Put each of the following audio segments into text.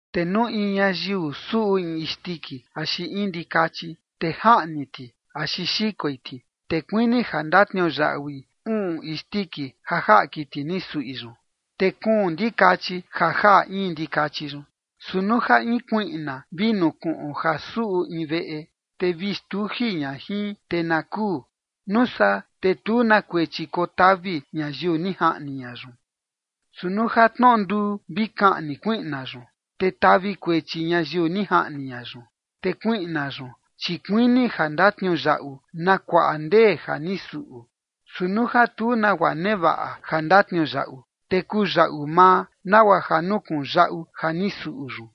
’Te nuu in ñayiu suꞌu in isndiki axi in ndikachi, te jaꞌni ti axi xikoi ti, te kuini ja ndatniuyaꞌui uꞌun isndiki ja jaꞌa kiti ni suꞌi yun, te kuun ndikachi ja jaꞌa in ndikachi yun. ’Su nuu ja in kuiꞌna vi nukuꞌun ja suꞌu in veꞌe, te vi xtuji ña jin te na kuu, nuu saa te tu na kuechi kotavi ñayiu ni jaꞌni ña yun. Su nuu ja tnoꞌo nduu vi kaꞌni kuiꞌna yun, te tavi kuechi ñayiu ni jaꞌni ña yun. Te kuiꞌna yun chi kuini ja ndatniuyaꞌu na kuaꞌa ndee ja ni suꞌu. Su nuu ja tu nagua nevaꞌa ja ndatniuyaꞌu, te kuyaꞌu maa nagua ja nukuꞌun yaꞌu ja ni suꞌu yun.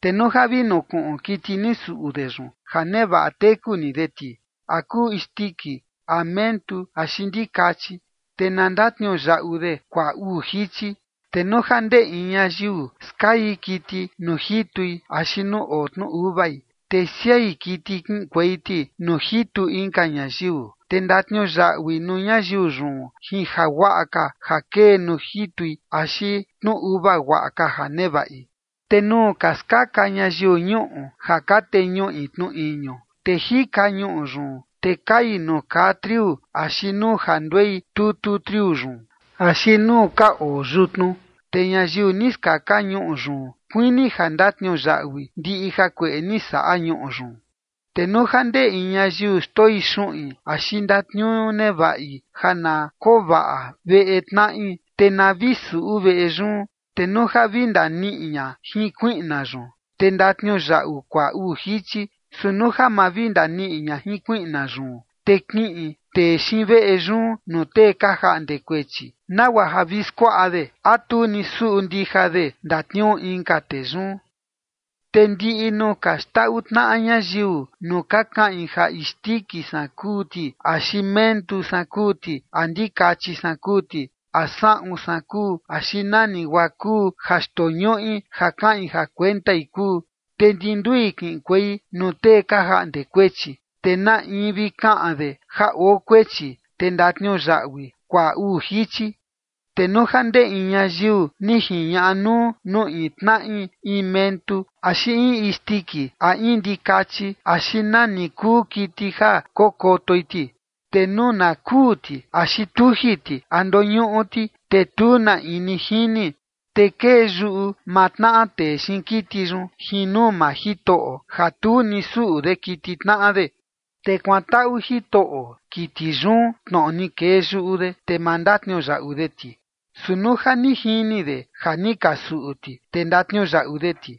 ’Te nuu ja vi nukuꞌun kiti ni suꞌu de yun ja nevaꞌa teku ni de ti, a kuu isndiki, a mentu, axi ndikachi, te na ndatniuyaꞌu de kuaꞌa uu jichi. ’Te nuu ja ndee in ñayiu skai kiti nuu jitui axi nuu oo tnu uvai, te siai kiti kiꞌinkuei ti nuu jitu inka ñayiu, te ndatniuyaꞌui nuu ñayiu yun jin jaguaꞌa ka ja kee nuu jitui axi tnu uva guaꞌa ka ja nevaꞌi. ’Te nuu ka skaka ñayiu ñuꞌu ja ka teñuꞌi tnu iñu, te jika ñuꞌu yun, te kai nuu kaa triu axi nuu ja nduei tutu triu yun, axi nuu ka oo yutnu, te ñayiu ni skaka ñuꞌu yun kuini ja ndatniuyaꞌui ndiꞌi jakueꞌe ni saꞌa ñuꞌu yun. ’Te nuu ja ndee in ñayiu xndoi xuꞌin axi ndatniuu nevaꞌi ja na koo vaꞌa veꞌe tnaꞌi, te na vi suꞌu veꞌe yun, te nuu ja vi ndaniꞌi ña jin kuiꞌna yun, te ndatniuyaꞌu kuaꞌa uu jichi. Su nuu ja ma vi ndaniꞌi ña jin kuiꞌna yun, te kiꞌin tee xiin veꞌe yun nuu tee ka jaꞌnde kuechi, nagua ja vi skuaꞌa de a tu ni suꞌu ndija de ndatniuu inka tee yun. ’Te ndiꞌi nuu ka xndaꞌu tnaꞌa ñayiu nuu ka kaꞌin ja isndiki san kuu ti axi mentu san kuu ti, a ndikachi san kuu ti, a saꞌun san kuu, axi nani guaa kuu ja xndoñuꞌi ja kaꞌin ja kuentai kuu, te ndi ndui kiꞌinkuei nuu tee ka jaꞌnde kuechi, te na in vi kaꞌan de ja oo kuechi, te ndatniuyaꞌui kuaꞌa uu jichi. ’Te nuu ja ndee in ñayiu ni jiñaꞌa nuu nuu in tnaꞌi in mentu axi in isndiki, a in ndikachi axi nani kuu kiti ja kokotoi ti, te nuu na kuu ti, axi tuji ti, a ndoñuꞌu ti, te tu na in ni jini, te kee yuꞌu maa tnaꞌa tee xiin kiti yun jin nuu maa Jitoꞌo ja tu ni suꞌu de kiti tnaꞌa de. Te kuantaꞌu jitoꞌo kiti yun tnoꞌo ni kee yuꞌu de, te ma ndatniuyaꞌu de ti. Su nuu ja ni jini de ja ni ka suꞌu ti, te ndatniuyaꞌu de ti.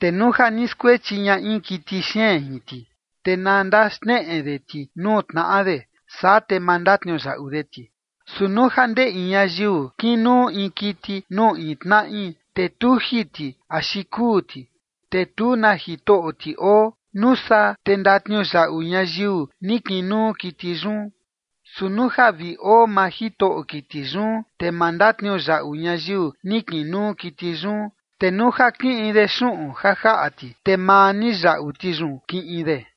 Te nuu ja ni skuechi ña in kiti xeen jin ti, te na ndaxneꞌe de ti nuu tnaꞌa de. Saa te ma ndatniuyaꞌu de ti. Su nuu ja ndee in ñayiu kinuu in kiti nuu in tnaꞌi, te tuji ti axi kuu ti, te tu na jitoꞌo ti oo, nuu saa te ndatniuyaꞌu ñayiu ni kinuu kiti yun. Su nuu ja vi oo maa jitoꞌo kiti yun, te ma ndatniuyaꞌu ñayiu ni kinuu kiti yun. Te nuu ja kiꞌin de xuꞌun ja jaꞌa ti, te maa ni yaꞌu ti yun kiꞌin de.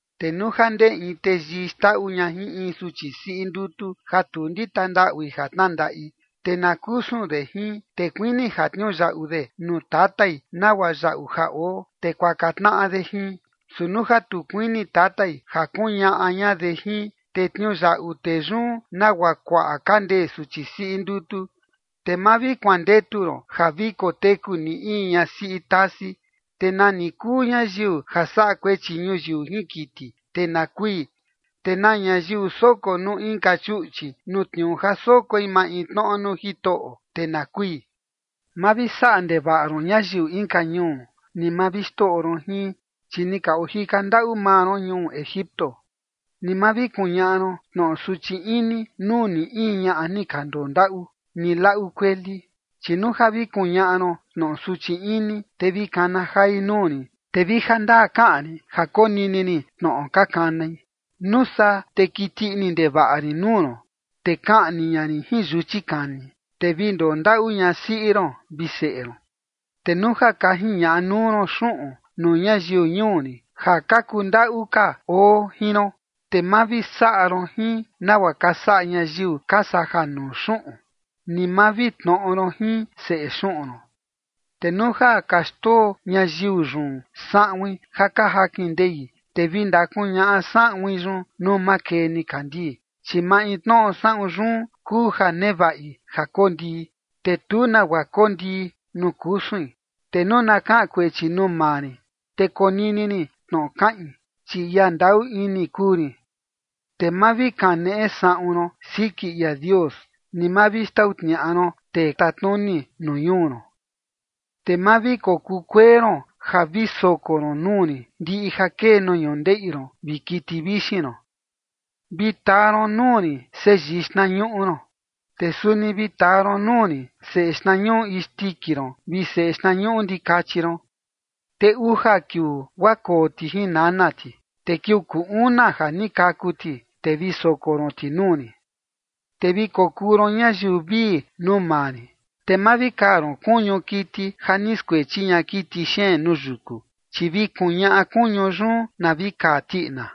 ’Te nuu ja ndee in teyii xndaꞌu ña jin in suchi siꞌi ndutu ja tu ndita ndaꞌui ja tnandaꞌi, te na kusun de jin, te kuini ja tniuyaꞌu de nuu tatai nagua yaꞌu ja oo, te kuaka tnaꞌa de jin. Su nuu ja tu kuini tatai ja kuñaꞌa ña de jin, te tniuyaꞌu tee yun nagua kuaꞌa ka ndee suchi siꞌi ndutu. ’Te ma vi kuandetu ron ja vi koteku ni in ñasiꞌi tasi. ’Te nani kuu ñayiu ja saꞌa kuechi ñuyiu jin kiti, te na kui. ’Te na ñayiu soko nuu inka chuꞌchi, nuu tniuu ja sokoi maintnoꞌo nuu Jitoꞌo, te na kui. ’Ma vi saꞌa ndevaꞌa ron ñayiu inka ñuu, ni ma vi xndoꞌo ron jin, chi ni ka ojika ndaꞌu maa ron ñuu Egipto. ’Ni ma vi kuñaꞌa ron tnoꞌo suchi ini nuu ni in ñaꞌa ni ka ndondaꞌu, ni laꞌu kueli. Chi nuu ja vi kuñaꞌa ron tnoꞌo suchi ini, te vi kana jai nuu rin, te vi jandaa kaꞌan rin ja konini rin tnoꞌo ka kanai. Nuu saa te kiti ini ndevaꞌa rin nuu ron, te kaꞌni ña rin jin yuchi kani, te vi ndondaꞌu ñasiꞌi ron vi seꞌe ron. ’Te nuu ja ka jiñaꞌa nuu ron xuꞌun nuu ñayiu ñuu rin ja ka kundaꞌu ka oo jin ron, te ma vi saꞌa ron jin nagua ka saꞌa ñayiu ka saja nuu xuꞌun, ni ma vi tnoꞌo ron jin seꞌe xuꞌun ron. Te nuu ja ka xndoo ñayiu yun saꞌuin ja ka jakin ndei, te vi ndakuñaꞌa saꞌuin yun nuu makee nikandii, chi maintnoꞌo saꞌun yun kuu ja nevaꞌi ja kondii, te tu nagua kondii nuu kusuin. Te nuu na kaꞌan kuechi nuu maa rin, te konini rin tnoꞌo kaꞌin, chi ia ndaꞌu ini kuu rin. ’Te ma vi kaneꞌe saꞌun ron siki ia Dios, ni ma vi xtau tniaꞌa ron tee tatnuni nuu ñuu ron. ’Te ma vi kokuu kuee ron ja vi soko ron nuu rin ndiꞌi ja kee nuu ñundeꞌi ron vi kiti vixin ron. ’Te vi taa ron nuu rin seyii xtnañuꞌu ron. Te suni vi taa ron nuu rin seꞌe xtnañuꞌu isndiki ron vi seꞌe xtnañuꞌu ndikachi ron. Te uja kiuu guaa koo ti jin nana ti, te kiuu kuu una ja ni kaku ti, te vi soko ron ti nuu rin. ’Te vi kokuu ron ñayiu vii nuu maa rin. Te ma vi kaa ron kuñu kiti ja ni skuechi ña kiti xeen nuu yuku, chi vi kuñaꞌa kuñu yun na vi kaa tiꞌina.